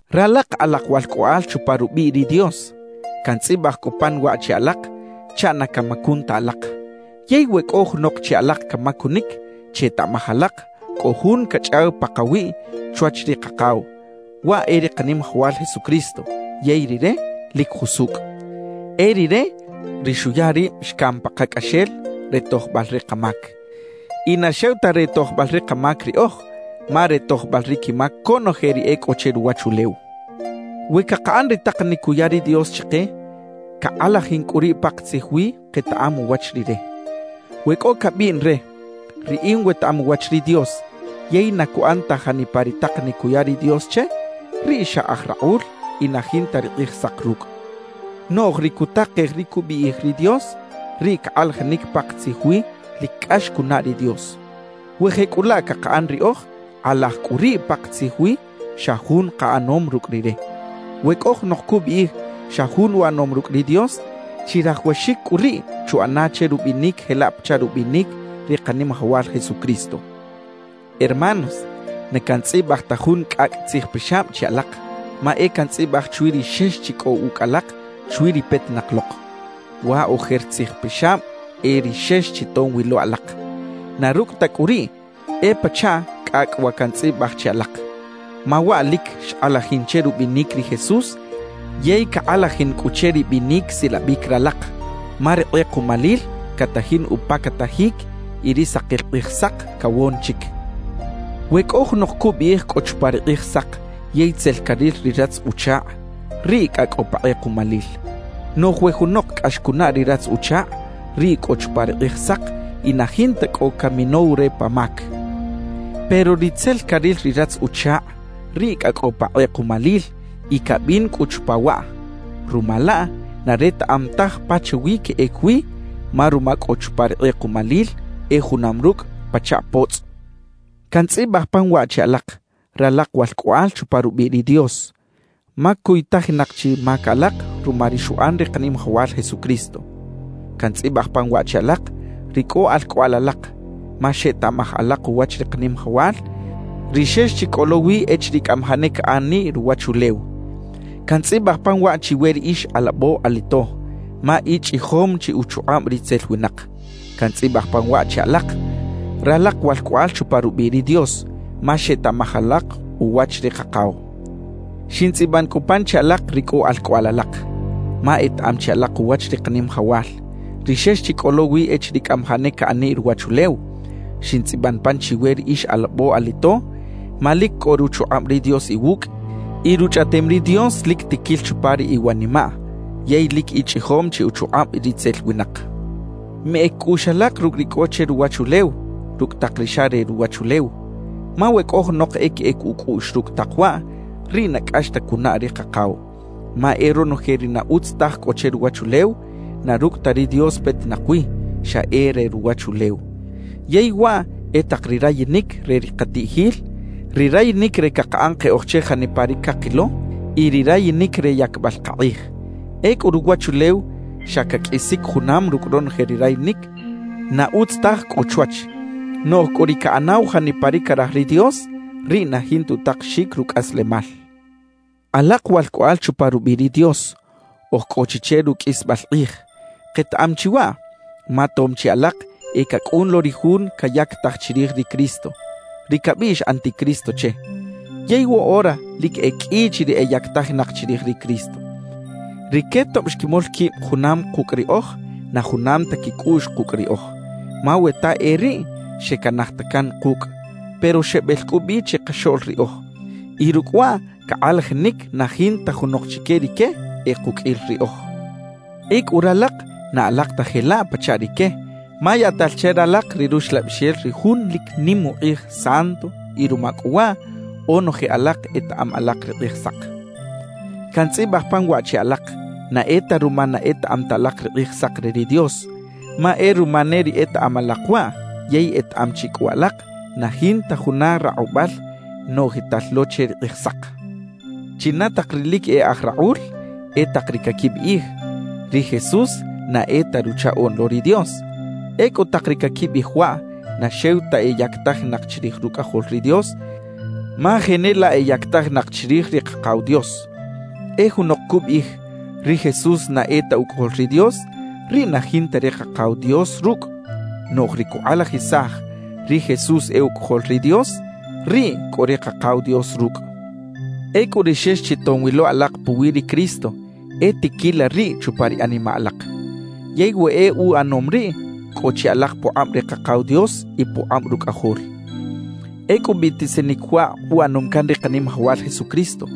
Ralak alak walcꞌoꞌal chupa rubiꞌ ri Dios, cantzꞌibaj cꞌu pan waꞌ che alak chaꞌ na camacun ta alak. Yey we cꞌo junok che alak camacunic, chetaꞌmaj alak cꞌo Jun cachꞌaw pakawiꞌ chwach ri Kakaw, waꞌ e ri Kanimajawal Jesucristo, yey Rire lic jusucꞌ. E Rire ri xuya rib xcam pakacꞌaxel re tojbal ri kamac. Y na xew ta re tojbal ri kamac riꞌoj, ma re tojbal ri quimac conoje ri e cꞌo che ruwachulew. We cakaꞌan ri takanic cuya ri Dios chike, cakꞌalajin cꞌu riꞌ pakatzij wi ketaꞌam uwach Rire. We cꞌo cabiꞌn re: «Riꞌin wetaꞌam uwach ri Dios» yey na cuꞌan ta janipa ri takanic cuya ri Dios che, riꞌ xa aj rakꞌul y na jinta ri Kꞌijsak rucꞌ. Noꞌj ri cutakej ri cubiꞌij ri Dios, riꞌ cakꞌalajinic pakatzij wi lic cꞌax cunaꞌ ri Dios. We jecꞌulaꞌ cakaꞌan riꞌoj, kꞌalaj cꞌu riꞌ pakatzij wi xa jun kaꞌanom rucꞌ Rire. We cꞌo junok cubiꞌij xa jun uꞌanom rucꞌ ri Dios, chirajawaxic cꞌu riꞌ chuꞌana che rubinic jelaꞌ pachaꞌ rubinic ri Kanimajawal Jesucristo. Hermanos, na cantzꞌibaj ta jun cꞌacꞌ tzijpixab che alak, ma e cantzꞌibaj chwi ri xex chi cꞌo ucꞌ alak chwi ri petinak lok. Wa ojer tzijpixab e ri xex chi tom wi lo alak. Na rucꞌ ta cꞌu riꞌ, e pachaꞌ cꞌacꞌ wa cantzꞌibaj che alak, ma waꞌ lic xkꞌalajin che rubinic ri Jesús yey cakꞌalajin cꞌu che ri binic silabic ralak, ma ri kꞌekuꞌmalil catajin upacatajic y ri sakil Kꞌijsak cawon chic. We cꞌo junok cubiꞌij cꞌo chupa ri Kꞌijsak yey tzel caril ri ratz-uchakꞌ, riꞌ cꞌa cꞌo pa kꞌekuꞌmalil. Noꞌj we junok cꞌax cunaꞌ ri ratz-uchakꞌ, riꞌ cꞌo chupa ri Kꞌijsak y na jinta cꞌo caminow re pa mac. Pero ri tzel caril ri ratz-uchakꞌ, riꞌ cꞌa cꞌo pa kꞌekuꞌmalil y cabin cꞌu chupa waꞌ. Ruma laꞌ, na retaꞌam taj pachawi queꞌec wi, ma ruma cꞌo chupa ri kꞌekuꞌmalil e junam rucꞌ pachaꞌ potzꞌ. Cantzꞌibaj pan waꞌ che alak, ralak walcꞌoꞌal chupa rubiꞌ ri Dios, ma cuytajinak chi mac alak ruma ri xuꞌan ri Kanimajawal Jesucristo. Cantzꞌibaj pan waꞌ che alak ri cꞌo alcꞌoꞌal alak, ma xetaꞌmaj alak uwach ri Kanimajawal, ri xex chi cꞌo lo wi echiriꞌ cꞌamajaꞌ ne caꞌaniꞌ ruwachulew. Cantzꞌibaj pan waꞌ chiwe ri ix alabo-alito, ma ichꞌijom chi uchukꞌab ritzel winak. Cantzꞌibaj pan waꞌ che alak, ralak walcꞌoꞌal chupa rubiꞌ ri Dios; ma xetaꞌmaj alak uwach ri Kakaw. Xintzꞌiban cꞌu pan che alak ri cꞌo alcꞌoꞌal alak, ma etaꞌam chi alak uwach ri Kanimajawal, ri xex chi cꞌo lo wi echiriꞌ cꞌamajaꞌ ne caꞌaniꞌ ruwachulew. Xintzꞌiban pan chiwe ri ix alabo-alito, ma lic cꞌo ruchukꞌab ri Dios iwucꞌ y Ruchꞌaꞌtem ri Dios lic tiquil chupa ri iwanimaꞌ yey lic ichꞌijom chi uchukꞌab ritzel winak. Meꞌec cꞌuꞌx alak rucꞌ ri cꞌo che ruwachulew rucꞌ tak ri xa re ruwachulew. Ma we cꞌo junok e queꞌec ucꞌuꞌx rucꞌ tak waꞌ, riꞌ na cꞌax ta cunaꞌ ri Kakaw. Ma e ronoje ri na utz taj cꞌo che ruwachulew, na rucꞌ ta ri Dios petinak wi, xa e re ruwachulew. Yey waꞌ e tak ri rayinic re ri katiꞌjil, ri rayinic re cakaꞌan keꞌoj che janipa ri cakilo y ri rayinic re yacbal kakꞌij. Ecꞌu ruwachulew xa caqꞌuisic junam rucꞌ ronoje ri rayinic na utz taj cꞌo chwach; noꞌj cꞌu ri caꞌanaw janipa ri caraj ri Dios, riꞌ na jinta utakexic rucꞌaslemal. Alak walcꞌoꞌal chupa rubiꞌ ri Dios, oj cꞌo chi che ruqꞌuisbal kꞌij. Ketaꞌam chi waꞌ, ma tom chi alak e cacꞌun lo ri jun cayactaj chirij ri Cristo, ri cabiꞌx “anticristo” che. Yey woꞌora lic e qꞌui chi ri eyactajinak chirij ri Cristo. Rique tob xquimol quib junam kucꞌ riꞌoj, na junam ta quicꞌuꞌx kucꞌ riꞌoj. Ma we ta e riꞌ, xecanaj ta can kucꞌ. Pero xebel cꞌu bi chikaxoꞌl riꞌoj, y rucꞌ waꞌ cakꞌalajinic na jinta junok chique rique e kuqꞌuil riꞌoj. Ecꞌu ralak na alak ta jelaꞌ pachaꞌ rique, ma yaꞌtal che ralak ri Ruxlabixel ri Jun lic nim ukꞌij Santo y ruma cꞌu waꞌ onoje alak etaꞌam alak ri Kꞌijsak. Cantzꞌibaj pan waꞌ che alak, na e ta ruma na etaꞌam ta alak ri Kꞌijsak re ri Dios, ma e ruma ne ri etaꞌam alak waꞌ yey etaꞌam chi cꞌu alak na jinta juna rakꞌubal noꞌjital lo che ri Kꞌijsak. ¿China tak ri lic e aj rakꞌul? E tak ri caquibiꞌij: «Ri Jesús na e ta Ruchaꞌoꞌn lo ri Dios.» Ecꞌu tak ri caquibiꞌij waꞌ, na xew ta eyactajinak chirij Rucꞌajol ri Dios, ma jenelaꞌ eyactajinak chirij ri Kakaw Dios. E junok cubiꞌij: «Ri Jesús na e ta Ucꞌajol ri Dios,» riꞌ na jinta ri Kakaw Dios rucꞌ. Noꞌj ri cukꞌalajisaj: «Ri Jesús e Ucꞌajol ri Dios,» riꞌ cꞌo ri Kakaw Dios rucꞌ. Ecꞌu ri xex chi tom wi lo alak puwi ri Cristo, e tiquila riꞌ chupa ri animaꞌ alak. Yey we e uꞌanom riꞌ, cꞌo chi alak pukꞌab ri Kakaw Dios y pukꞌab Rucꞌajol. Ecꞌu biꞌtisinic waꞌ uꞌanom can ri Kanimajawal Jesucristo: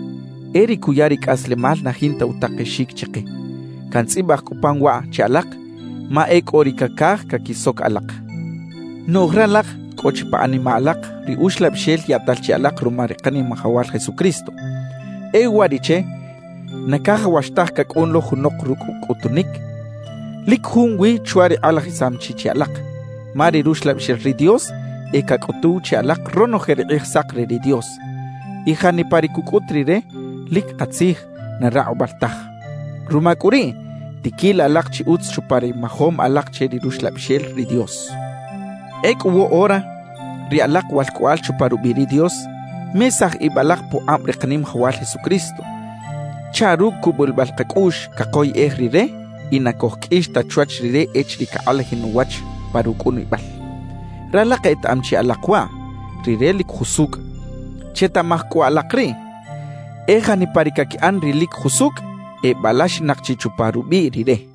E ri cuya ri cꞌaslemal na jinta utakexic chike. Cantzꞌibaj cꞌu pan waꞌ che alak, ma e cꞌo ri cacaj caquisoc alak. Noꞌj ralak cꞌo chi pa animaꞌ alak ri Uxlabixel yaꞌtal che alak ruma ri Kanimajawal Jesucristo. E uwariꞌche na cajawax taj cacꞌun lo junok rucꞌ cꞌutunic lic junwi chwa ri kꞌalajisam chi che alak, ma ri Ruxlabixel ri Dios e cacꞌutuw che alak ronoje ri Kꞌijsak re ri Dios. Y janipa ri cucꞌut Rire, lic katzij, na rakꞌubal taj. Ruma cꞌu riꞌ, tiquila alak chi utz chupa ri majom alak che ri Ruxlabixel ri Dios. Ecꞌu woꞌora, ri alak walcꞌoꞌal chupa rubiꞌ ri Dios, mesaj ib alak pukꞌab ri Kanimajawal Jesucristo, chaꞌ rucꞌ cubulibal kacꞌuꞌx cakoyꞌej Rire y na cojqꞌuix ta chwach Rire echiriꞌ cakꞌalajin uwach pa rucꞌunibal. Ralak etaꞌam chi alak waꞌ: Rire lic jusucꞌ. Chetaꞌmaj cꞌu alak riꞌ: E janipa ri caquiꞌan ri lic jusucꞌ, ebalaxinak chi chupa rubiꞌ Rire.